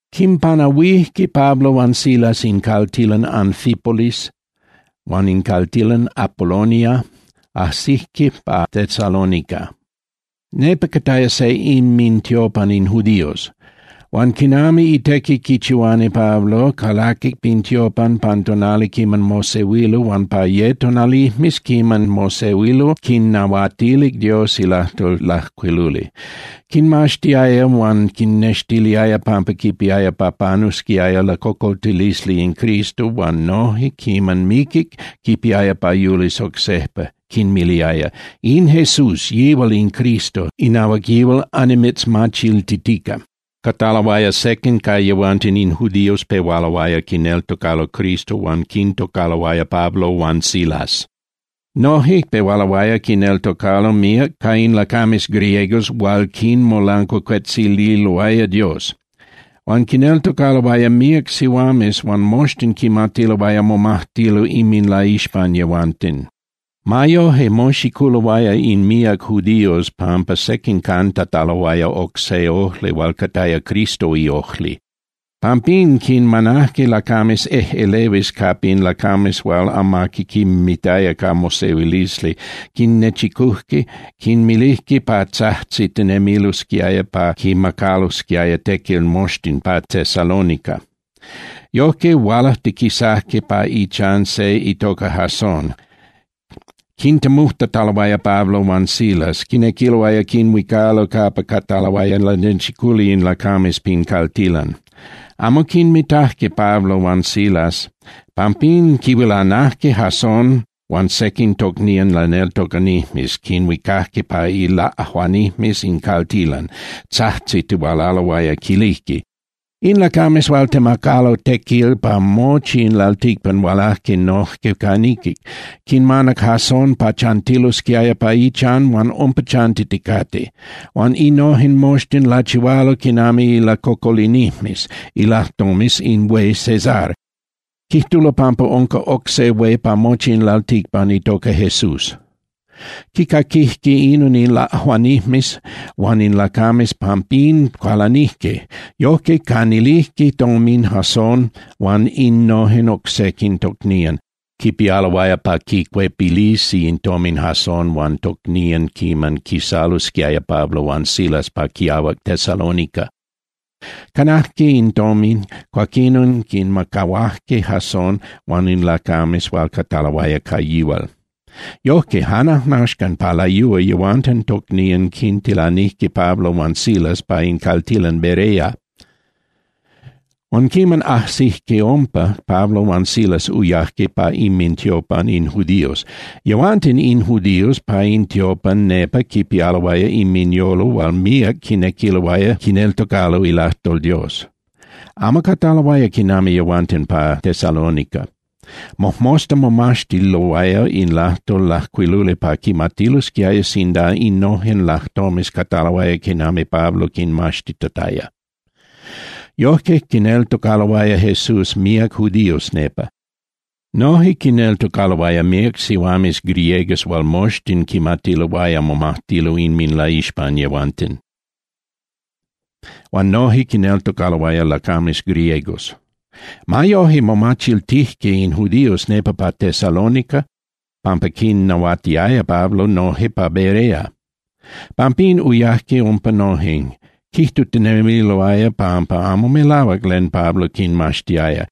Quimpanahuijque Pablo huan Silas in caltilan Anfípolis huan in caltilan Apolonia, ajsijque pa Tesalónica. Nepa cataya se inmintiopan in judíos. Huan quinami itequi quichihuani Pablo, calaquic pin tiopan pan tonali quiman mosehuilo huan pa ye tonalijmes quiman mosehuilo quinnahuatilic Dios ilajtol lajcuiluli. Quinmaxtiaya huan quinnextiliaya pampa quipiaya pa panusquiaya lacocoltilisli in Cristo huan noje quiman miquic, quipiaya pa yulis oc sejpa, quinmiliaya: —In Jesús, yihual in Cristo, inahuac yihual annimitzmachiltitica. Cataloaya sequin ca yehuanten in judíos pehualoaya quineltocalo Cristo huan quintocaloaya Pablo huan Silas. Noje pehualoaya quineltocalo míac ca in lacames griegos hual quimolancuacuetzililoaya Dios. Huan quineltocaloaya míac sihuames hual moxtin quimatiloaya momajtilo inminlaixpan yehuanten. Ma yoje, moxiculoaya in míac judíos pampa sequin cantataloaya oc se ojli hual cataya Cristo iojli. Pampín quinmanajque lacames ejꞌelehuis capa in lacames hual amaqui quinmitaya ca mosehuilisli, quinnechicujque, quinmilijque pa tzajtzitinemilosquiaya pa quimacalosquiaya tequil moxtin pa Tesalónica. Yojque, hualajtiquisajque pa ichan se itoca Jason, quintemujtataloaya Pablo huan Silas, quinequiloaya quinhuicalo capa cataloaya lanechiculi in lacames pin caltilan. Amo quinmitajque Pablo huan Silas, pampín quihuilanajque Jason huan sequin tocnían laneltocanijmes, quinhuicajque pa ilaꞌajuanijmes in caltilan, tzajtzitihualaloaya, quilijque: —In lacames hual temacalo tequil pa mochi in lalticpan hualajque noje ca niquic. Quinmanac Jason pa chantilosquiaya pa ichan huan umpa chantiticate. Huan innojen moxtin lachihualo quinami ilacocolinijmes ilajtomes in hué Cesar, quijtulo pampa unca oc se hué pa mochi in lalticpan, itoca Jesús. Quicaquijque inon in laꞌajuanijmes huan in lacames, pampín cualanijque. Yojque, canilijque tomin Jason huan innojen oc sequin tocnían, quipialoaya pa quicuepilisi in tomin Jason huan tocnían quiman quisalosquiaya Pablo huan Silas pa quiahuac Tesalónica. Canajque in tomin, cuaquinon quinmacahuajque Jason huan in lacames hual cataloaya ca yihual. Yojque, jan ajnaxcan pa layúa yehuanten tocnían quintilanijque Pablo huan Silas pa in caltilan Berea. Huan quiman ajsijque umpa, Pablo huan Silas uyajque pa inmintiopan in judíos. Yehuanten in judíos pa in tiopan nepa quipialoaya inminyolo hual míac quinequiloaya quineltocalo ilajtol Dios, amo cataloaya quinami yehuanten pa Tesalónica. Mojmosta momaxtiloaya in lajtol lajcuiluli pa quimatilosquiaya sinda innojen lajtomes cataloaya quinami Pablo quinmaxtitataya. Yojque, quineltocaloaya Jesús míac judíos nepa. Noje quineltocaloaya míac sihuames griegas hual moxtin quimatiloaya momajtilo inminlaixpan yehuanten. Huan noje quineltocaloaya lacames griegos. Ma yoje, momachiltijque in judíos nepa pa Tesalónica pampa quinnahuatiaya Pablo noje pa Berea. Pampín uyajque umpa noje, quijtutinemiloaya pampa amo melahuac len Pablo quimaxtiaya,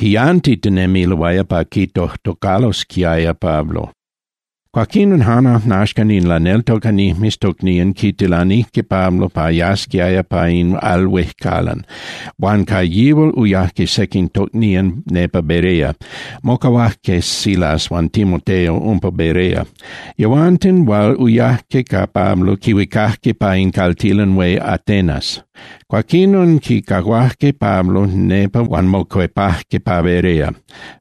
quiyantitinemiloaya pa quitojtocalosquiaya Pablo. Cuaquinon jan ajnaxcan in laneltocanijmes tocnían quitilanijque Pablo pa yasquiaya pa in al huejcalan, huan ca yihual uyajque sequin tocnían nepa Berea. Mocahuajque Silas huan Timoteo umpa Berea. Yehuanten hual uyajque ca Pablo quihuicajque pa in caltilan hué Atenas. Cuaquinon quicahuajque Pablo nepa huan mocuepajque pa Berea.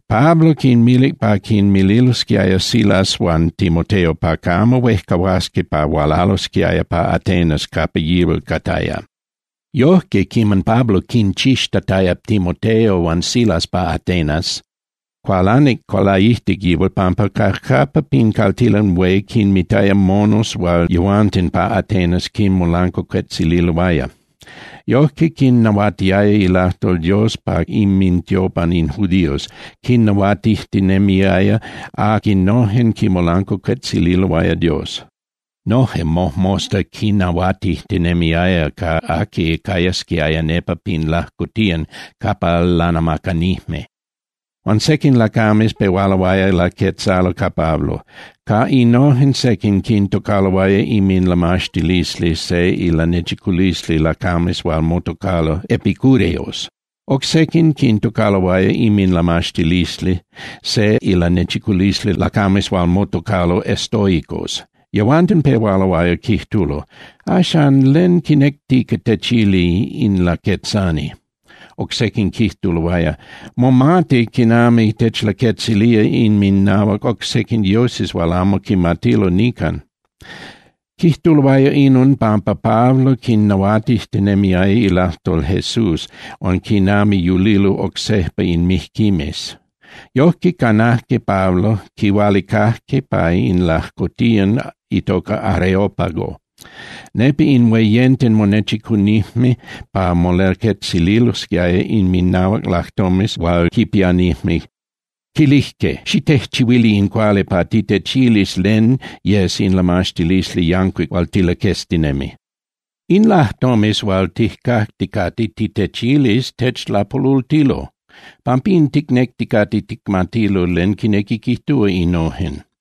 Pablo quinmilic pa quinmililosquiaya Silas huan Timoteo pa camo huejcahuasqui pa hualalosquiaya pa Atenas capa yihual cataya. Yojque, quiman Pablo quinchixtataya Timoteo huan Silas pa Atenas, cualanic laijtic yihual pampa cajcapa pin caltilan hué quinmitaya monos hual yehuanten pa Atenas quinmolancuacuetzililoaya. Yojque, quinnahuatiaya ilajtol Dios pa inmintiopan in judíos, quinnahuatijtinemiaya aquinojen quimolancuacuetzililoaya Dios. Noje mojmosta quinnahuatijtinemiaya ca aqui cayasquiaya nepa pin lajcotiyan capa lanamacanijme. Huan sequin lacames pehualoaya laquetzalo ca Pablo. Ca innojen sequin quintocaloaya inminlamaxtilisli se ilanechiculisli lacames hual motocalo epicúreos. Oc sequin quintocaloaya inminlamaxtilisli se ilanechiculisli lacames hual motocalo estoicos. Yehuanten pehualoaya quijtulo: —Axcan, ¿len quinectica techili in laquetzani? Oc sequin quijtuloaya: —Momati quinequi techlaquetzilía inminahuac oc sequin dioses hual amo quimatilo nican. Quijtuloaya inon pampa Pablo quinnahuatijtinemiaya ilajtol Jesús huan quinami yulilo oc sejpa in mijquimes. Yojque canajque Pablo, quihualicajque pa in lajcotiyan itoca Areópago. Nepa in hueyenten monechicunijme pa molaquetzililosquiaya inminahuac lajtomes hual quipianijme. Quilijque: —Xitejchihuili in cuali pa titechilis len yes in lamaxtilisli yancuic hual tilaqueztinemi. In lajtomes hual tijcacticate titechilis techlapolultilo. Pampín ticnecticate ticmatilo len quinequi quijtúa innojen.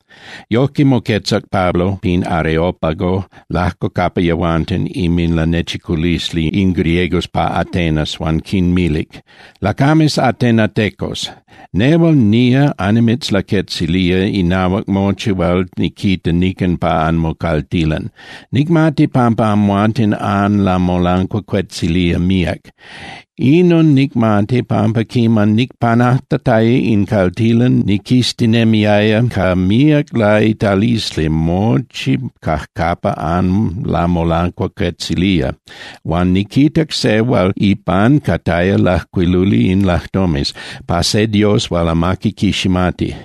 Yojque moquetzac Pablo pin Areópago lajco capa yehuanten inminlanechiculisli in griegos pa Atenas huan quinmilic: —Lacames atenatecos, nehual nía annimitzlaquetzilía inahuac mochi hual niquita nican pa anmocaltilan. Nicmati pampa amhuanten anlamolancuacuetzilía míac. Inon nicmati, pampa quiman nicpanajtataya in caltilan niquiztinemiaya ca míac laitalisli mochi cajcapa anlamolancuacuetzilía huan niquitac se hual ipan cataya lajcuiluli in lajtomes: “Pa se dios hual amaqui quiximati.”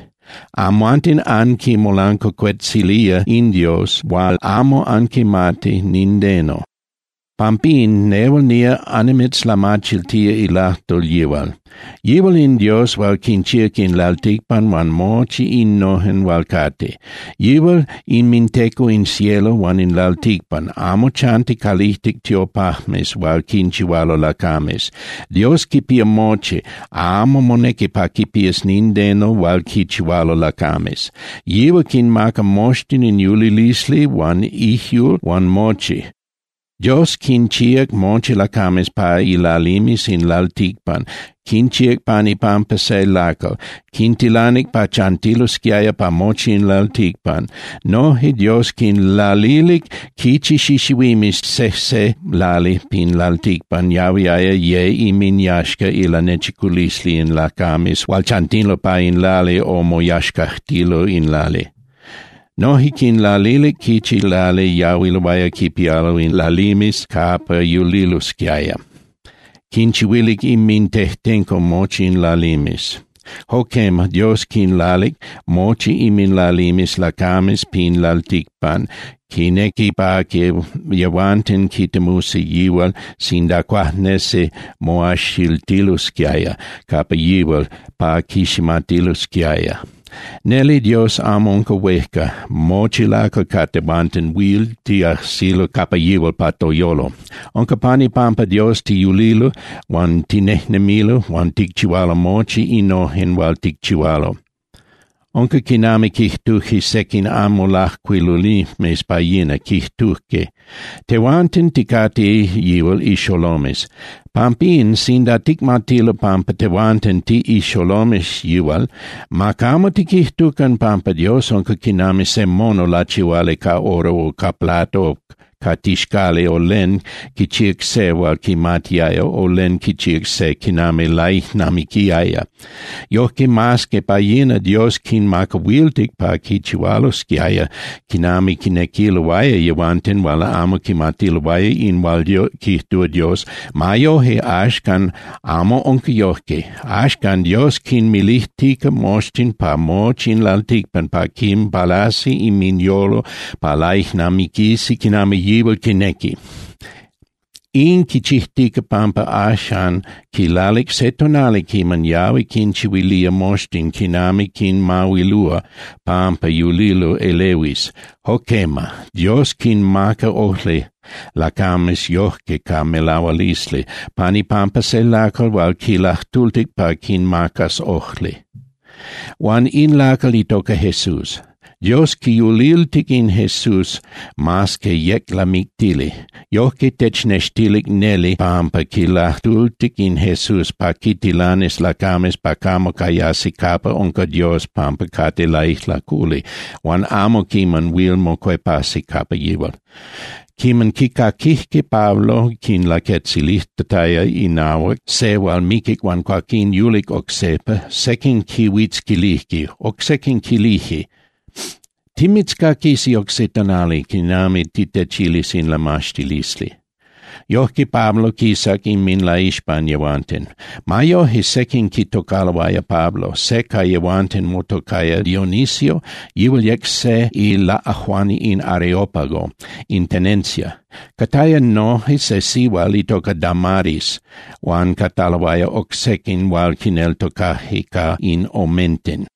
Amhuanten anquimolancuacuetzilía in Dios hual amo anquimati nindeno. Pampín nehual nía annimitzlamachiltía ilajtol yihual. Yihual in Dios hual quinchíac in lalticpan huan mochi innojen hual cate. Yihual inminteco in cielo huan in lalticpan, amo chanti calijtic tiopajmes hual quinchihualo lacames. Dios quipía mochi, amo monequi pa quipías nindeno hual quinchihualo lacames. Yihual quinmaca moxtin in yulilisli huan ijyul huan mochi. Dios quinchíac mochi lacames pa ilalimes in lalticpan, quinchíac pan ipampa se lacal, quintilanic pa chantilosquiaya pa mochi in lalticpan. Noje Dios quinlalilic quichi xixihuimes sejse lali pin lalticpan yahuiaya ye inminyaxca ilanechiculisli in lacames hual chantilo pa in lali o moyaxcajtililo in lali. Noje quinlalilic quichi lali yahuiloaya quipialo in lalimes capa yulilosquiaya, quinchihuilic inmintejtenco mochi in lalimes. Jo quema, Dios quinlalic mochi inminlalimes lacames pin lalticpan, quinequi pa yehuanten quitemusi yihual sinda cuajnesi moajxiltilosquiaya capa yihual pa quiximatilosquiaya. Neli Dios amo unca huejca, mochi lacal ca tehuanten huil tiajsilo capa yihual pa toyolo. Unca pan ipampa Dios tiyulilo huan tinejnemilo huan ticchihualo mochi innojen hual ticchihualo. Unca quinami quijtujque sequin anmolajcuilunijmes pa yina, quijtujque: “Tehuanten ticate yihual ixolomes.” Pampín, sinda ticmatilo pampa tehuanten tiꞌixolomes yihual, ma camo tiquijtucan pampa Dios unca quinami se mono lachihuali ca oro o ca plata o ca tixcali o len quichíac se hual quimatiaya, o len quichíac se quinami laijnamiquiaya. Yojque, mas que pa yina Dios quinmacahuiltic pa quichihualosquiaya quinami quinequiloaya yehuanten hual amo quimatiloaya in hual quijtúa Dios, ma yoje axcan amo unca yojque. Axcan Dios quinmilijtica moxtin pa mochi in lalticpan pa quinpalasi inminyolo pa laijnamiquisi quinami yihual quinequi. In quichijtica pampa axan quilalic se tonali quiman yahui quinchihuilía moxtin quinami quinmahuilúa pampa yulilo elehuis. Jo quema, Dios quinmaca ojli lacames yojque ca melahualisli pan ipampa se lacal hual quilajtultic pa quinmacas ojli. Huan in lacal itoca Jesús. Dios quiyuliltic in Jesús mas que yec lamictili. Yojque technextilic neli pampa quilajtultic in Jesús pa quintilanis lacames pa camo cayasi capa unca Dios pampa cate laijlaculi, huan amo quiman huil mocuepasi capa yihual. Quiman quicaquijque Pablo quinlaquetzilijtataya inahuac se hual miquic huan cuaquín yulic oc sejpa, sequin quihuitzquilijque, oc sequin quilijque: —Timitzcaquisi oc se tonali quiman titechilis in lamaxtilisli. Yojque Pablo quisac inminlaixpan yehuanten. Ma yoje, sequin quitocaloaya Pablo, se ca yehuanten motocaya Dionisio, yihual yec se ilaꞌajuani in Areópago, in tenencia. Cataya noje se sihual itoca Damaris, huan cataloaya oc sequin hual quineltocajque ca in omenten.